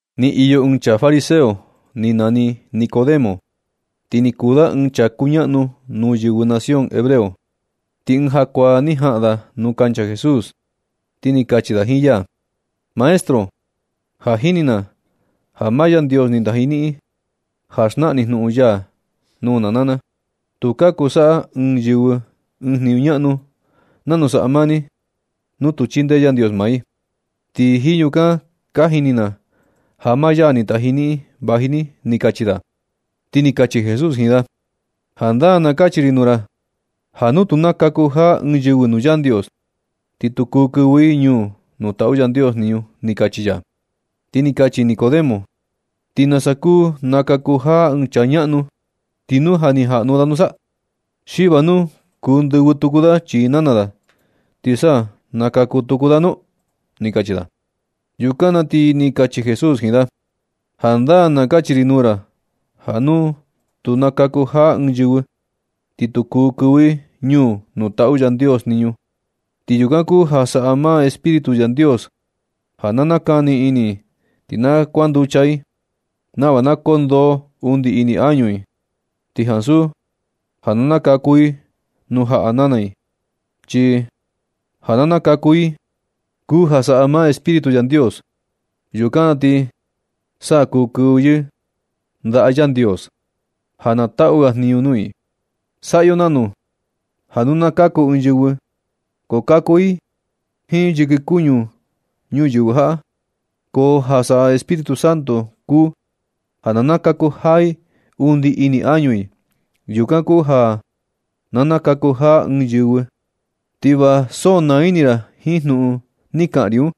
Ni iyo ɨɨn chaa fariseo ni nani Nicodemo. Ti ni kuu da ɨɨn chaa kuñaꞌnu nuu yɨvɨ nación hebreo. Ti ɨɨn jakuaa ni jaꞌan da nuu kancha Jesús, ti ni kachi da jiin ya: ―Maestro, ja ka jini na ja maa Yandios ni taji niꞌin ja na xnaꞌan ni jnuꞌun ya nuu na naa na. Tu ka kuu saꞌa ɨɨn yɨvɨ ɨɨn jniñu ñaꞌnu nanu saꞌa maa ni nu tu chindee Yandios maa i. Ti jiin yukan ka jini na ja maa ya ni taji niꞌin vaji ni ―ni kachi da. Ti ni kachi Jesús jiin da: ―Jandaa na kachi ri nuu ra ja nu tu nakaku jaa ɨɨn yɨvɨ nuu Yandios, ti tu kuu kɨvɨ i ñuu nuu taꞌu Yandios jniñu ―ni kachi ya. Ti ni kachi Nicodemo: ―¿Ti nasa kuu nakaku jaa ɨɨn chaa ñaꞌnu, ti nu ja ni jaꞌnu da nusa? ¿Xi va nu kuu ndɨvɨ tuku da chii nana da, ti sa nakaku tuku da nu? ―ni kachi da. Yukan na ti ni kachi Jesús jiin da: ―Jandaa na kachi ri nuu ra ja nu tu nakaku jaa ɨɨn yɨvɨ, ti tu kuu kɨvɨ i ñuu nuu taꞌu Yandios jniñu. Ti yukan kuu ja saꞌa maa Espíritu Yandios ja na nakani ini i ti na kuanducha i, nava na kondoo undi ini añu i, ti ansu ja na nakaku i nuu jaꞌa nana i. Chi ja na nakaku i kuu ja saꞌa maa Espíritu Yandios. Yukan na ti sa kuu kɨvɨ i ndaꞌa Yandios ja na taꞌu ga jniñu nuu i. Saꞌa yo nanu ja nu na kaku ɨɨn yɨvɨ, ko kaku i jiin yɨkɨ kuñu ñuyɨvɨ jaꞌa. Ko ja saꞌa Espíritu Santo kuu ja na nakaku jaa i undi ini añu i. Yukan kuu ja na nakaku jaa ɨɨn yɨvɨ. Ti va so naa ini ra jiin jnuꞌun ni kaꞌan ri un,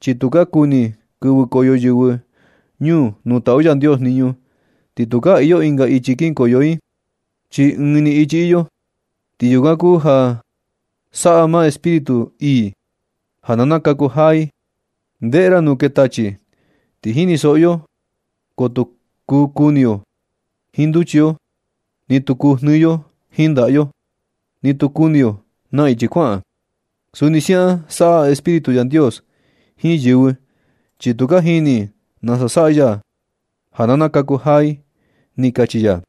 chi nu ka kuni kɨvɨkoyo yɨvɨ ñuu nuu taꞌu Yandios jniñu, ti tukaa iyo ɨnga ichi kinkoyo i, chi ɨɨn ni ichi iyo. Ti yukan kuu ja saꞌa maa Espíritu ii ja na nakaku jaa i. Ndeꞌe ra nu kee tachi, ti jinisoꞌo yo ko tu kuu kuni yo jiin nduchi yo, ni tu kuu jnɨɨ yo jiin ndaꞌa yo, ni tu kuni yo na ichi kuaꞌan. Suni siaꞌan saꞌa Espíritu Yandios jiin yɨvɨ, chi tu ka jini i nasa saꞌa ya ja na nakaku jaa i ―ni kachi ya.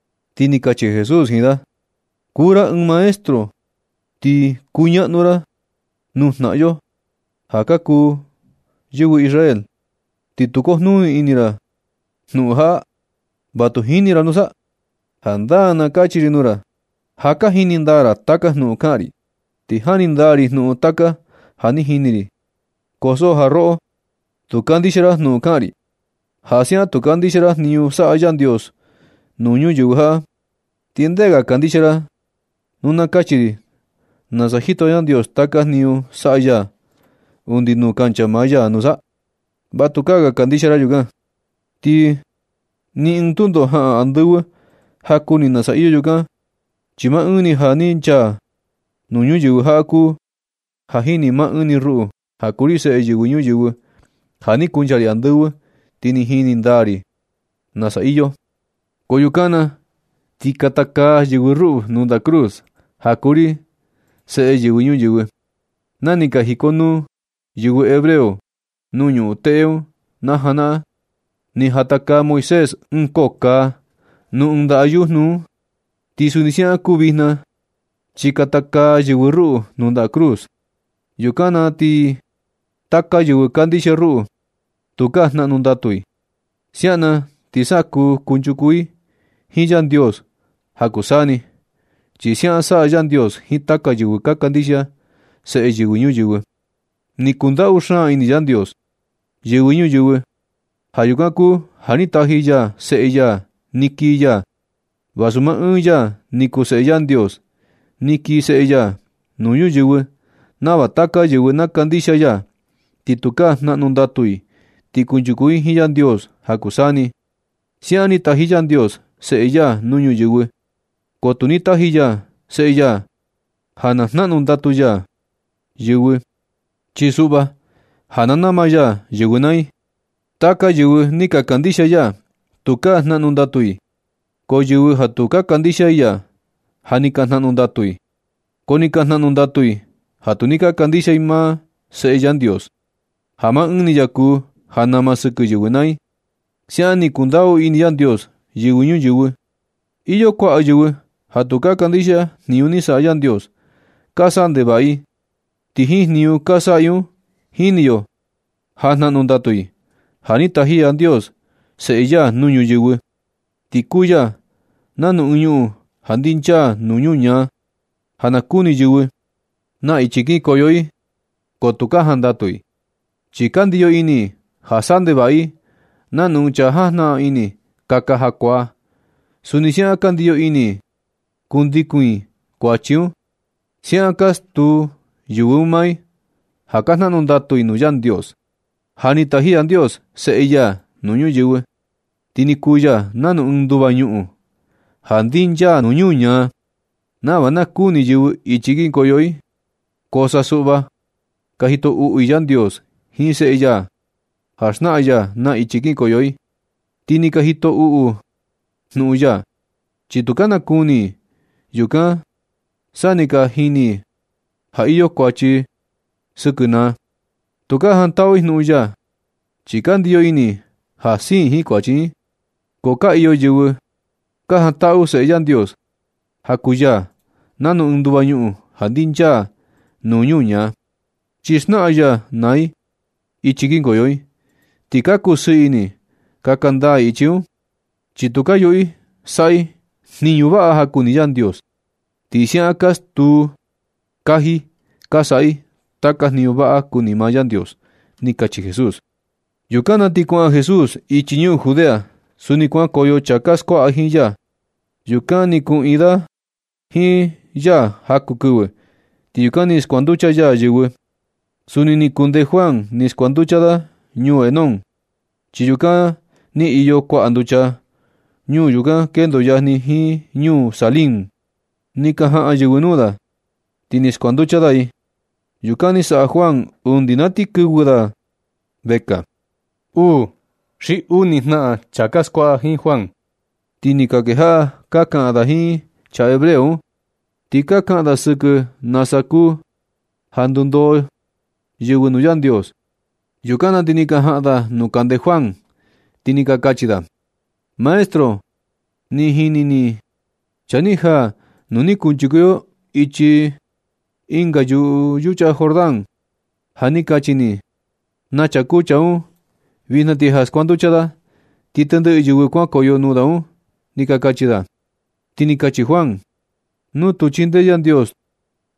Ti ni kachi Jesús jiin da: ―Kuu ra ɨɨn maestro, ti kuñaꞌnu ra nuu jnaꞌan yo ja ka kuu yɨvɨ Israel, ti tu kujnuni ini ra jnuꞌun jaꞌa, ¿Va tu jini ra nusa? Jandaa na kachi ri nuu ra, ja ka jini ndaa ra taka jnuꞌun kaꞌan ri, ti jani ndaa ri jnuꞌun taka ja ni jini ri. Ko so ja roꞌo, tu kandixia ra jnuꞌun kaꞌan ri. Ja siaꞌan tu kandixia ra jniñu saꞌa Yandios nuu ñuyɨvɨ jaꞌa, ¿Ti ndee ga ja kandixia ra nu na kachi ri nasa jito Yandios taka jniñu saꞌa ya undi nuu kancha maa ya nusa? Va tukaa ga kandixia ra yukan. Ni ɨɨn tundo jaꞌan andɨvɨ ja kuni nasa iyo yukan, chi maa ɨɨn ni ja ni chaa nuu ñuyɨvɨ jaꞌa kuu ja jini. Maa ɨɨn ni ruꞌu ja kuu ri Seꞌe Yɨvɨ Ñuyɨvɨ, ja ni kuncha ri andɨvɨ, ti jini ndaa ri nasa iyo. Ko yukan na ti katakaa yɨvɨ ruꞌu nuu ndaꞌa cruz, ja kuu ri Seꞌe Yɨvɨ Ñuyɨvɨ. Na ni ka jikonuu yɨvɨ hebreo nuu ñuꞌun teꞌe un na janaꞌan, ni jatakaa Moisés ɨɨn koo kaa nuu ɨɨn ndaꞌa yujnu un un. Ti suni siaꞌan kuu vijna, chi katakaa yɨvɨ ruꞌu nuu ndaꞌa cruz. Yukan na ti taka yɨvɨ kandixia ruꞌu, tukaa jnaꞌnu ndatu i. Siaꞌan na ti sa kuu kunchuku i jiin Yandios ja kuu saa ni. Chi siaꞌan saꞌa Yandios jiin taka yɨvɨ ka kandixia Seꞌe Yɨvɨ Ñuyɨvɨ. Ni kundaꞌu xaan ini Yandios yɨvɨ ñuyɨvɨ. Ja yukan kuu ja ni taji ya seꞌe ya ni kii ya, vasu maa ɨɨn ya ni kuu Seꞌe Yandios. Ni kii seꞌe ya nuu ñuyɨvɨ nava taka yɨvɨ na kandixia ya, ti tukaa jnaꞌnu ndatu i, ti kunchuku i jiin Yandios ja kuu saa ni. Siaꞌan ni taji Yandios Seꞌe ya nuu ñuyɨvɨ. Ko tu ni taji ya Seꞌe ya ja na kaꞌnu ndatu ya yɨvɨ, chi suꞌva ja na nama ya yɨvɨ naa i. Taka yɨvɨ ni ka kandixia ya, tukaa jnaꞌnu ndatu i, ko yɨvɨ ja tu ka kandixia i ya, ja ni ka jnaꞌnu ndatu i. Ko ni ka jnaꞌnu ndatu i ja tu ni ka kandixia i maa Seꞌe Yandios, ja maa ɨɨn ni ya kuu ja nama sɨkɨ yɨvɨ naa i. Siaꞌan ni kundaꞌu ini Yandios yɨvɨ ñuyɨvɨ. Iyo kuaꞌa yɨvɨ ja tu ka kandixia jniñu ni saꞌa Yandios. Ka saꞌa ndevaꞌa i, ti jiin jniñu ka saꞌa i un jini yo ja ka jnaꞌnu ndatu i. Ja ni taji Yandios seꞌe ya nuu ñuyɨvɨ, ti kuu ya nanu ɨɨn ñuꞌun ja ndinchaa nuu ñuñaa, ja na kuni yɨvɨ na ichi kinkoyo i, ko tu ka jandatu i. Chi ka ndiyo ini i ja saꞌa ndevaꞌa i nanu ɨɨn chaa jajnaꞌan ini kaka jakuaa. Suni siaꞌan ka ndiyo ini i kundikun i kuachi un. Siaꞌan ka stuu yɨvɨ un maa i ja ka jnaꞌnu ndatu i nuu Yandios. Ja ni taji Yandios seꞌe ya nuu ñuyɨvɨ, ti ni kuu ya nanu ɨɨn nduva ñuꞌun ja ndinchaa nuu ñuñaa, nava na kuni yɨvɨ ichi kinkoyo i. Ko sa suꞌva ka jito uꞌu i Yandios jiin seꞌe ya ja xnaꞌan ya na ichi kinkoyo i. Ti ka jito uꞌu i jnuꞌun ya, chi tu ka na kuni i yukan sa ni ka jini i ja iyo kuachi sɨkɨ naa. Tu ka jantaꞌu i jnuꞌun ya, chi ka ndiyo ini i ja siin i jiin kuachi un. Ko ka iyo yɨvɨ ka jantaꞌu Seꞌe Yandios, ja kuu ya nanu ɨɨn nduva ñuꞌun ja ndinchaa nuu ñuñaa. Chi xnaꞌan ya naa i ichi kinkoyo i, ti ka kusɨɨ ini kaka ndaa i ichi un, chi tu ka yuꞌu i saꞌa i jniñu vaꞌa ja kuni Yandios. Ti siaꞌan ka stuu kaji ja ka saꞌa i taka jniñu vaꞌa kuni maa Yandios ―ni kachi Jesús. Yukan na ti kuaꞌan Jesús ichi ñuu Judea. Suni kuankoyo chaa ka skuaꞌa jiin ya. Yukan ni kuꞌiin da jiin ya jaku kɨvɨ, ti yukan ni skuanducha ya yɨvɨ. Suni ni kundee Juan ni skuanducha da ñuu Enón, chi yukan ni iyo kuaꞌa nducha. Ñuu yukan kendo yajni jiin ñuu Salím. Ni ka jaꞌan yɨvɨ nuu da, ti ni skuanducha da i. Yukan ni saꞌa Juan undi na ti kɨvɨ ga da vekaa. Uu xi uni jnaꞌan chaa ka skuaꞌa jiin Juan, ti ni ka kejaꞌa ka kaꞌan da jiin chaa hebreo un. Ti ka kaꞌan da sɨkɨ ja nasa kuu ja ka ndundoo yɨvɨ nuu Yandios. Yukan na ti ni ka jaꞌan da nuu kande Juan, ti ni ka kachi da: ―Maestro, ni jini ni chaa ni jaa nuu ni kunchuku yo ichi ɨnga yuꞌu yucha Jordán, ja ni kachi ni na chaa kuu chaa un. Vijna ti ja skuanducha da, ti tendɨꞌɨ yɨvɨ kuankoyo nuu da un ―ni ka kachi da. Ti ni kachi Juan: ―Nu tu chindee Yandios,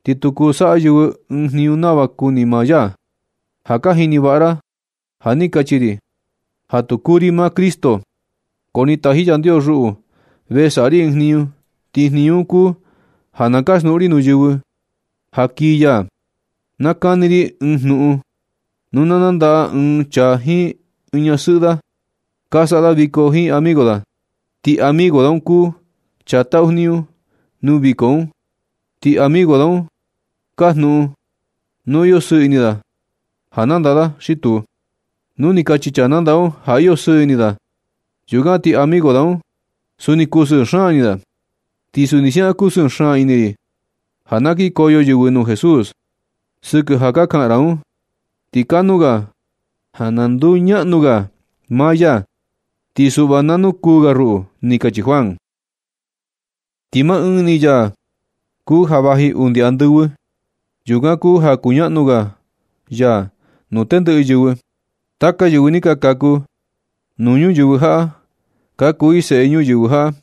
ti tu kuu saꞌa yɨvɨ ɨɨn jniñu nava kuni maa ya. Ja ka jini vaꞌa ra ja ni kachi ri ja tu kuu ri maa Cristo. Ko ni taji Yandios ruꞌu ve saꞌa ri ɨɨn jniñu ti jniñu un kuu ja na kaxnuꞌun ri nuu yɨvɨ ja kii ya. Na kani ri ɨɨn jnuꞌun. Nu na nandaꞌa ɨɨn chaa jiin ñasɨꞌɨ da, ka saꞌa da viko jiin amigo da. Ti amigo da un kuu chaa taꞌu jniñu nuu viko un, ti amigo da un kajnuꞌun nu iyo sɨɨ ini da ja nandaꞌa da xi tu. Nu ni kachi chaa nandaꞌa un ja iyo sɨɨ ini da, yukan ti amigo da un, suni kusɨɨ xaan ini da. Ti suni siaꞌan kusɨɨ xaan ini ri ja na kinkoyo yɨvɨ nuu Jesús. Sɨkɨ ja ka kaꞌan ra un, ti kanuu ga ja na nduñaꞌnu ga maa ya, ti suꞌva na nukuu ga ruꞌu ―ni kachi Juan. Ti maa ɨɨn ni ya kuu ja vaji undi andɨvɨ, yukan kuu ja kuñaꞌnu ga ya nuu tendɨꞌɨ yɨvɨ. Taka yɨvɨ ni ka kaku nuu ñuyɨvɨ jaꞌa ka kuu i seꞌe ñuyɨvɨ jaꞌa,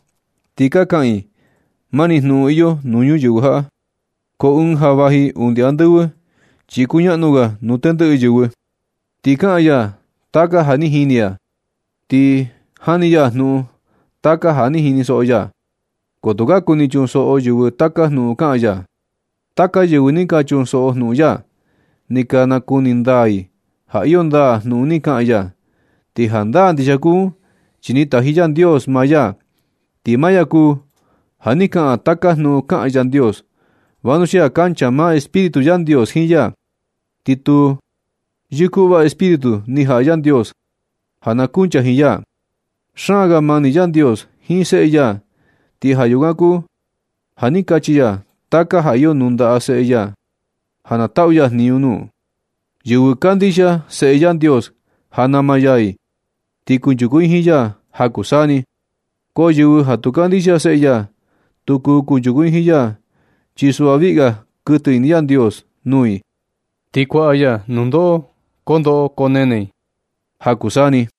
ti ka kaꞌan i mani maa jnuꞌun iyo nuu ñuyɨvɨ jaꞌa. Ko ɨɨn ja vaji undi andɨvɨ, chi kuñaꞌnu ga nuu tendɨꞌɨ yɨvɨ. Ti kaꞌan ya taka ja ni jini ya, ti jani ya jnuꞌun taka ja ni jinisoꞌo ya, ko tu ka kuni chunsoꞌo yɨvɨ taka jnuꞌun kaꞌan ya. Taka yɨvɨ ni ka chunsoꞌo jnuꞌun ya, ni ka nakuni ndaa i ja iyo ndaa jnuꞌun ni kaꞌan ya. Ti jandaa ndixia kuu un, chi ni taji Yandios maa ya, ti maa ya kuu ja ni kaꞌan taka jnuꞌun kaꞌan Yandios, vanuxia kancha maa Espíritu Yandios jiin ya, ti tu yɨkuꞌva Espíritu ni jaꞌa Yandios ja na kuncha jiin ya. Xaan ga mani Yandios jiin seꞌe ya. Ti ja yukan kuu ja ni nachiꞌi ya taka ja iyo nuu ndaꞌa seꞌe ya ja na taꞌu ya jniñu nuu. Yɨvɨ kandixia Seꞌe Yandios ja nama ya i, ti kunchuku i jiin ya ja kuu saa ni. Ko yɨvɨ ja tu kandixia Seꞌe ya, tu kuu kunchuku i jiin ya, chi suꞌva viꞌi ga kuɨtɨ ini Yandios nuu i, ti kuaꞌa ya nundoꞌo koo ndoꞌo koo nene i ja kuu saa ni.